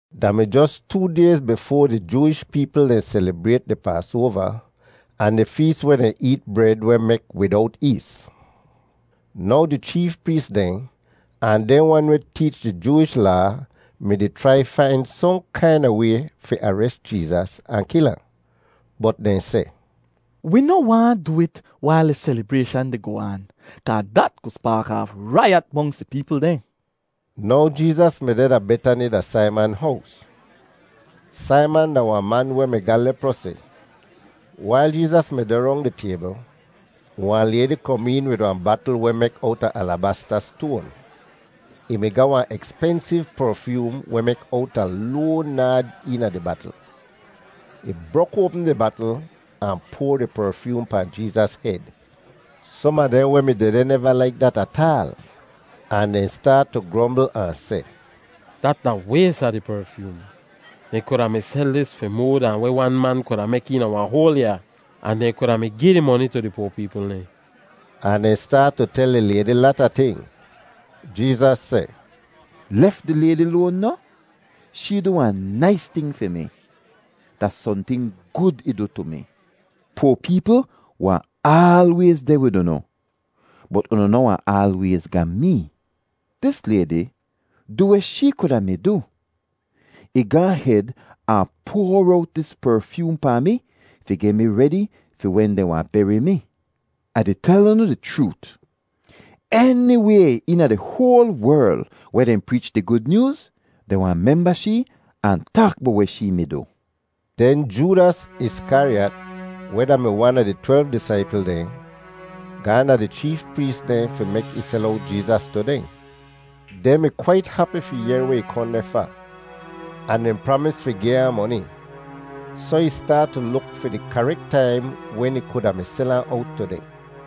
Da mi jos too dayz bifoa di Jooish peepl dehn selibrayt di Paasoava ahn di fees weh dehn eet bred weh mek widowt ees. Now di cheef prees dehn ahn dehn wan weh teech di Jooish Laa mi-di chrai fain sohn kaina way fi ares Jeezas ahn kil ahn. Bot dehn seh, “Wi noh waahn du it wail di selibrayshan di goh aan kaa dat ku spaak aaf raiyat monks di peepl dehn.” Now Jeezas mi deh da Betani da Saiman hows. Saiman da wahn man weh mi ga leprosi. Wail Jeezas mi deh rong di taybl, wahn laydi kom een wid wahn batl weh mek owta alabasta stoan. Ih mi ga wahn ekspensiv perfyoom weh mek owta loan naad eena di batl. Ih brok oapm di batl ahn poar di perfyoom pahn Jeezas hed. Som a dehn weh mi dehdeh neva laik dat ataal ahn dehn staat tu grombl ahn seh, “Dat da ways a di perfyoom! Dehn kuda mi sel dis fi moa dahn weh wan man kuda mek eena wahn hoal yaa. Ahn dehn kuda mi gi di moni tu di poa peepl dehn.” Ahn dehn staat tu tel di laydi lata ting. Jeezas seh, “Lef di laydi loan noh? Shee du wahn nais ting fi mi. Da sohnting gud ih du tu mi. Poa peepl wahn aalwayz deh wid unu, bot unu noh wahn aalwayz ga mee. Dis laydi du weh shee kuda mi du. Ih gaahn hed ahn poar owt dis perfyoom pahn mi fi geh mi redi fi wen dehn wahn beri mi. Ah di tel unu di chroot, eniway eena di hoal werl weh dehn preech di Gud Nyooz, dehn wahn memba shee ahn taak bowt weh shee mi du.” Den Joodas Iskariyat, weh da-mi wan a di twelv disaipl dehn, gaahn da di cheef prees dehn fi mek ih sel owt Jeezas tu dehn. Dehn mi kwait hapi fi yehr weh ih kohn deh fa, ahn dehn pramis fi gi ahn moni. Soh ih staat tu luk fi di karek taim wen ih kuda mi sel ahn owt tu dehn.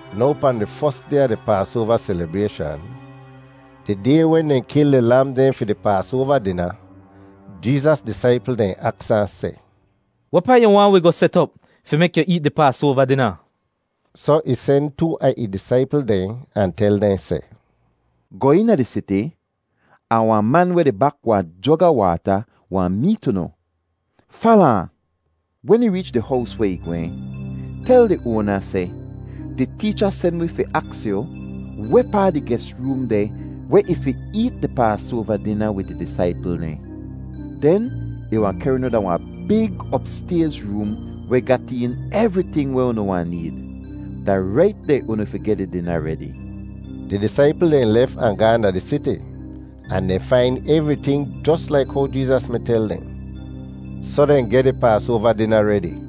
Now pahn di fos day a di Paasoava selibrayshan, di day wen dehn kil di lam dehn fi di Paasoava dina, Jeezas disaipl dehn aks ahn seh, “Wehpaa yu waahn wi goh set op fi mek yu eet di Paasoava dina?” Soh ih sen too a ih disaipl dehn ahn tel dehn seh, “Goh eena di siti, ahn wahn man weh di bak wahn jog a waata wahn meet unu. Fala ahn. Wen ih reech di hows weh ih gwehn, tel di oana seh, ‘Di teecha sen wi fi aks yu wehpaa di ges room deh weh ih fi eet di Paasoava dina wid ih disaipl dehn.’ Den ih wahn kehr unu da wahn big opstayz room weh gat een evriting weh unu wahn need. Da rait deh unu fi geh di dina redi.” Di disaipl dehn lef ahn gaahn da di siti, ahn dehn fain evriting jos laik how Jeezas mi tel dehn. Soh dehn geh di Paasoava dina redi.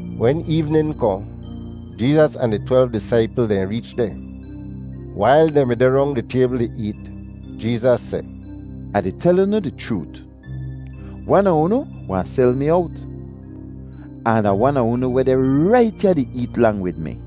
Wen eevnin kohn, Jeezas ahn di twelv disaipl dehn reech deh. Wail dehn mi deh rong di taybl di eet, Jeezas seh, “Ah di tel unu di chroot, wan a unu wahn sel mi owt, ahn da wan a unu weh deh rait ya di eet lang wid mi.”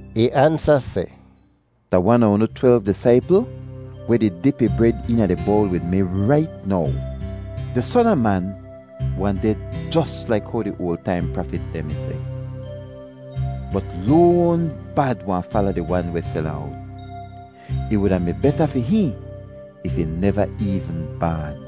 Ih ansa seh, “Da wan a unu twelv disaipl weh di dip ih bred eena di bowl wid mi rait now. Di Son a Man wahn ded jos laik how di oal taim prafit dehn mi seh, bot loan bad wahn fala di wan weh sel ahn owt. Ih wuda mi beta fi hihn if ih neva eevn baan!”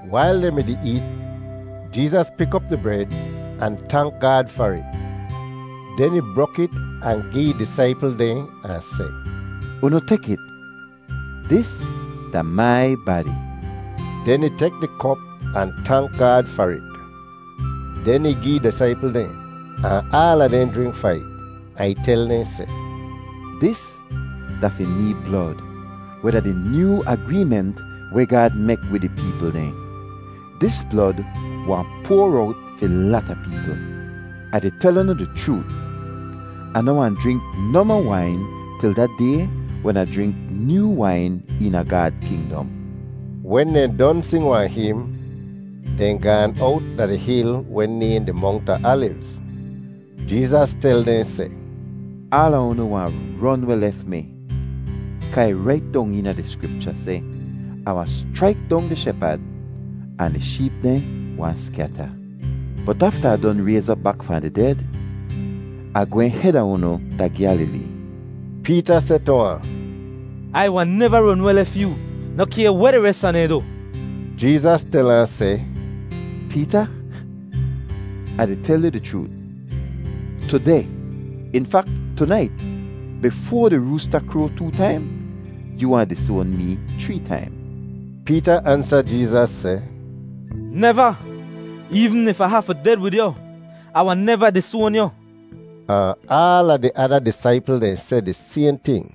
Wail dehn mi-di eet, Jeezas pik op di bred ahn tank Gaad far it. Den ih brok it ahn gi ih disaipl dehn ahn seh, “Unu tek it. Dis da mai badi.” Den ih tek di kop ahn tank Gaad far it; den ih gi ih disaipl dehn, ahn aala dehn jrink fahn it. Ahn ih tel dehn seh, “Dis da fi mee blod, weh da di nyoo agreement weh Gaad mek wid ih peepl dehn. Dis blod wahn poar owt fi lata peepl. Ah di tel unu di chroot, Ah noh wahn jrink nohmoh wain til da day wen Ah jrink nyoo wain eena Gaad kingdom.” Wen dehn don sing wahn him, dehn gaan owt da di hil weh nayhn di Mongt a Alivz. Jeezas tel dehn seh, “Aala unu wahn ron weh lef mi kaa ih rait dong eena di Skripcha seh, ‘Ah wahn schraik dong di shepad, ahn di sheep dehn wahn skyata.’ Bot afta Ah don rayz op bak fahn di ded, Ah gwehn heda unu da Gyalilee.” Peeta seh tu ahn, “Ai wahn neva ron weh lef yoo, noh kay weh di res a dehn du!” Jeezas tel ahn seh, “Peeta, Ah di tel yu di chroot, tudeh, in fak tunait, bifoa di roosta kroa too taim, yoo wahn disoan mee chree taim.” Peeta ansa Jeezas seh, “Neva! Eevn if Ah hafu ded wid yu, Ah wahn neva disoan yu!” Ahn aala di ada disaipl dehn seh di sayhn ting.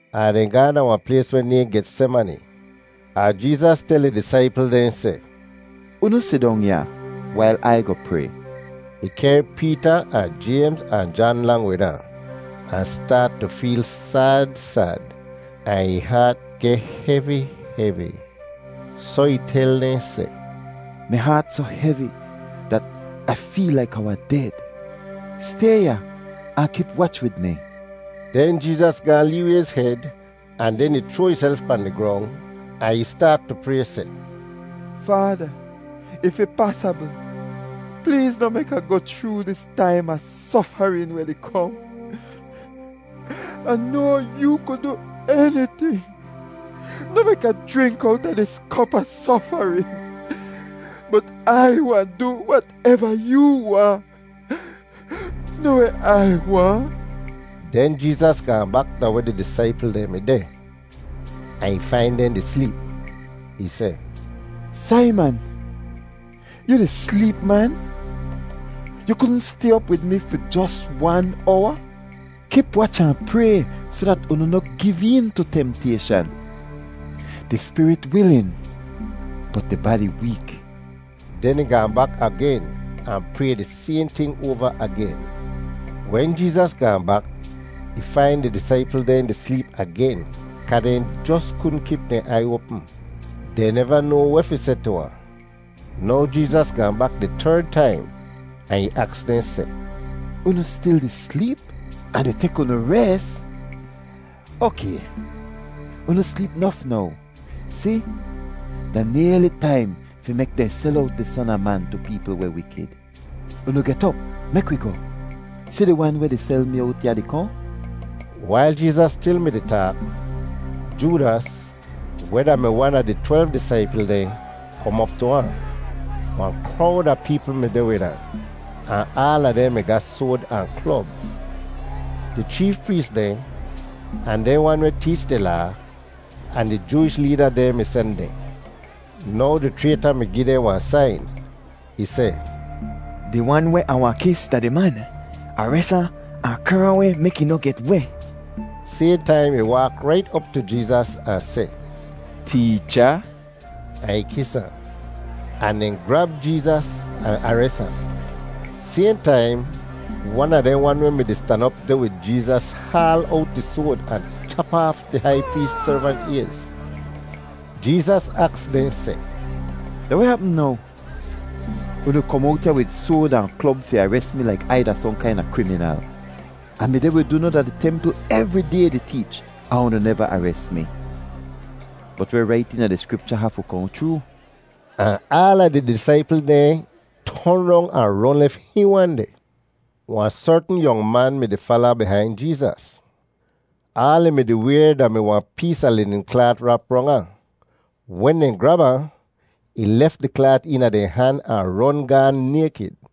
Ahn dehn gaahn da wahn plays weh nayhn Getsemani. Ahn Jeezas tel ih disaipl dehn seh, “Unu sidong ya wail Ai goh pray.” Ih kehr Peeta ahn Jaymz ahn Jan lang wid ahn, ahn staat tu feel sad sad ahn ih haat geh hevi hevi. Soh ih tel dehn seh, “Mi haat soh hevi dat Ah feel laik Ah wahn ded. Stay ya ahn kip wach wid mi.” Den Jeezas gaahn lee wayz hed ahn den ih chroa ihself pahn di grong ahn ih staat tu pray seh, “Faada, if ih pasabl, pleez noh mek Ah goh chroo dis taim a sofarin weh di kohn. Ah noa yoo ku du eniting. Noh mek Ah jrink owta dis kop a sofarin. Bot Ai wahn du wateva yoo waahn, noh weh Ai waahn.” Den Jeezas gaahn bak da weh di disaipl dehn mi deh, ahn ih fain dehn di sleep. Ih seh, “Saiman! Yu di sleep, man? Yu kudn stay op wid mi fi jos wan owa? Kip wach ahn pray soh dat unu noh giv een tu temtayshan. Di spirit wilin bot di badi week.” Den ih gaahn bak agen ahn pray di sayhn ting oava agen. Wen Jeezas gaahn bak, ih fain di disaipl dehn di sleep agen kaa dehn jos kudn kip dehn aiy oapm. Dehn neva noa weh fi seh tu ahn. Now Jeezas gaahn bak di terd taim ahn ih aks dehn seh, “Unu stil di sleep ahn di tek unu res? Okay, unu sleep nof now. Si, da nayli taim fi mek dehn sel owt di Son a Man tu peepl weh wikid. Unu get op! Mek wi goh! Si di wan weh di sel mi owt ya di kohn!” Wail Jeezas stil mi-di taak, Joodas, weh da-mi wan a di twelv disaipl dehn, kom op tu ahn. Wahn krowd a peepl mi deh wid ahn, ahn aala dehn mi ga soad ahn klob. Di cheef prees dehn, ahn dehn wan weh teech di Laa, ahn di Jooish leeda dehn mi sen dehn. Now di chrayta mi gi dehn wahn sain. Ih seh, “Di wan weh Ah wahn kis da di man. Ares ahn, ahn kehr ahn weh mek ih noh get weh.” Sayhn taim ih waak rait op tu Jeezas ahn seh, “Teecha!” ahn ih kis ahn. Ahn dehn grab Jeezas ahn ares ahn. Sayhn taim wan a dehn wan weh mi-di stan op deh wid Jeezas haal owt ih soad ahn chap aaf di hai prees servant ayz. Jeezas aks dehn seh, “Da weh hapm now? Unu kom owt ya wid soad ahn klob fi ares mi laik Ai da sohn kaina kriminal. Ah mi deh wid unu da di templ evri day di teech ahn unu neva ares mi. Bot weh rait eena di Skripcha hafu kohn chroo.” Ahn aala di disaipl dehn ton rong ahn ron lef hihn wan deh. Wahn sertn yong man mi-di fala bihain Jeezas. Aal ih mi-di wayr da-mi wahn pees a linin klaat rap rong ahn. Wen dehn grab ahn, ih lef di klaat eena dehn han ahn ron gaahn naykid.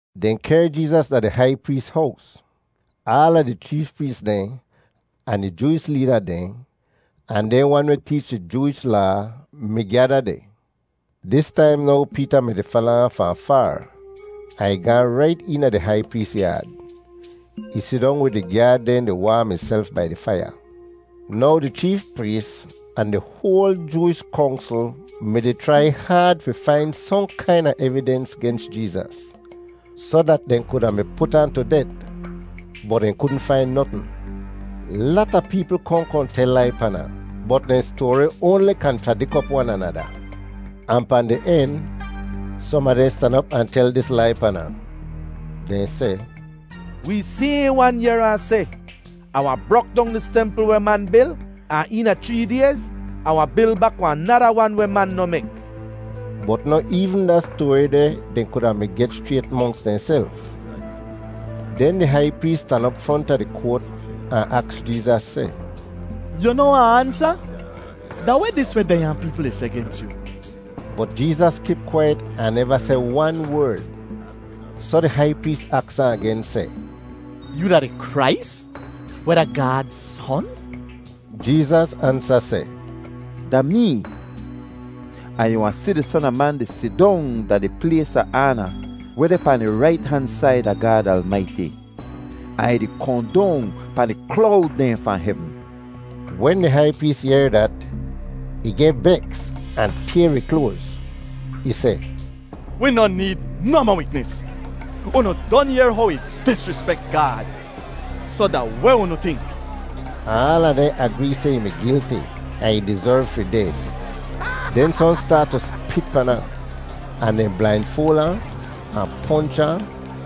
Dehn kehr Jeezas da di hai prees hows. Aala di cheef prees dehn ahn di Jooish leeda dehn, ahn dehn wan weh teech di Jooish Laa mi gyada deh. Dis taim now Peeta mi-di fala ahn fahn faar, ahn ih gaahn rait eena di hai prees yaad. Ih sidong wid di gyaad dehn di waam ihself bai di faiya. Now di cheef prees ahn di hoal Jooish Kongsl mi-di chrai haad fi fain sohn kaina evidens gens Jeezas, soh dat dehn kuda mi put ahn tu det. Bot dehn kudn fain notn. Lata peepl kohn kohn tel lai pan ahn, bot dehn stoari oanli kanchradik op wan anada. Ahn pahn di en, som a dehn stan op ahn tel dis lai pan ahn. Dehn seh, “Wee sayhn wan yehr ahn seh, ‘Ah wahn brok dong dis templ weh man bil, ahn eena chree dayz Ah wahn bil bak wahn nada wan weh man noh mek.’” Bot noh eevn da stoari deh dehn kuda mi geh schrayt monks dehnself. Den di hai prees stan op fronta di koat ahn aks Jeezas seh, “Yu noh wahn ansa? Da weh dis weh dehnya peepl di seh gens yu?” Bot Jeezas kip kwaiyet ahn neva seh wan werd, soh di hai prees aks ahn agen seh, “Yoo da di Krais, weh da Gaad Son?” Jeezas ansa seh, “Da mee. Ahn yu wahn si di Son a Man di sidong da di plays a aana weh deh pahn di rait han said a Gaad Almaiti, ahn ih di kohn dong pahn di klowd dehn fahn hevn.” Wen di hai prees yehr dat, ih geh beks ahn tayr ih kloaz. Ih seh, “Wi noh need nohmoh witnis. Unu don yehr how ih disrispek Gaad! Soh da weh unu tink?” Ahn aala dehn agree seh ih mi gilti ahn ih dizerv fi ded. Den sohn staat tu spit pan ahn, ahn dehn blainfoal ahn, ahn ponch ahn,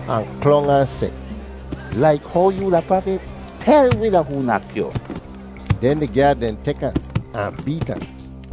ahn klong ahn seh, “Laik how yoo da prafit, tel wi da hoo nak yu.” Den di gyaad dehn tek ahn, ahn beet ahn.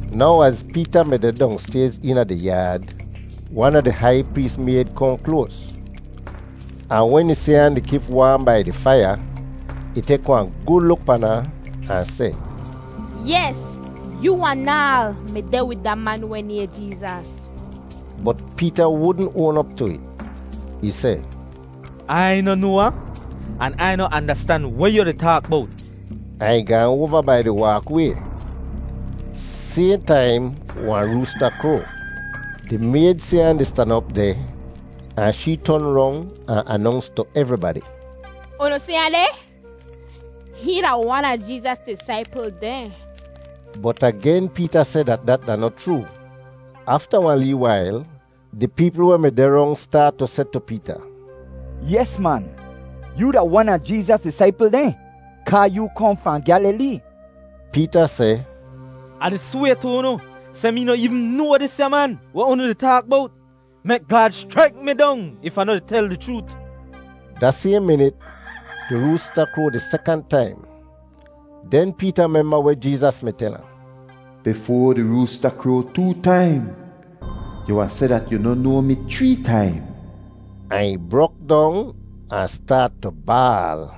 Now az Peeta mi deh dongstayz eena di yaad, wan a di hai prees mayd kohn kloas. Ahn wen ih si ahn deh di kip waam bai di faiya, ih tek wahn gud luk pan ahn, ahn seh, “Yes! Yoo anaal mi deh wid da man weh nayhn Jeezas.” Bot Peeta wudn oan op tu it. Ih seh, “Ai noh noa ahn an Ai noh andastan weh yu di taak bowt.” Ahn ih gaan oava bai di waakway. [Sayhn taim wahn roosta kroa.] Di mayd si ahn di stan op deh ahn shee ton rong ahn anonks tu evribadi, “Unu si ahn deh! Hihn da wan a Jeezas disaipl dehn!” Bot agen Peeta seh dat dat da noh chroo. Afta wahn lee wail, di peepl weh mi deh rong staat tu seh tu Peeta, “Yes, man! Yoo da wan a Jeezas disaipl dehn kaa yoo kohn fahn Gyalilee.” Peeta seh, “Ah di sway tu unu seh mee noh eevn noa disya man weh unu di taak bowt! Mek Gaad schraik mi dong if Ah noh di tel di chroot.” Da sayhn minit di roosta kroa di sekant taim. Den Peeta memba weh Jeezas mi tel ahn: “Bifoa di roosta kroa too taim, yu wahn seh dat yu noh noa mi chree taim.” Ahn ih brok dong ahn staat tu baal.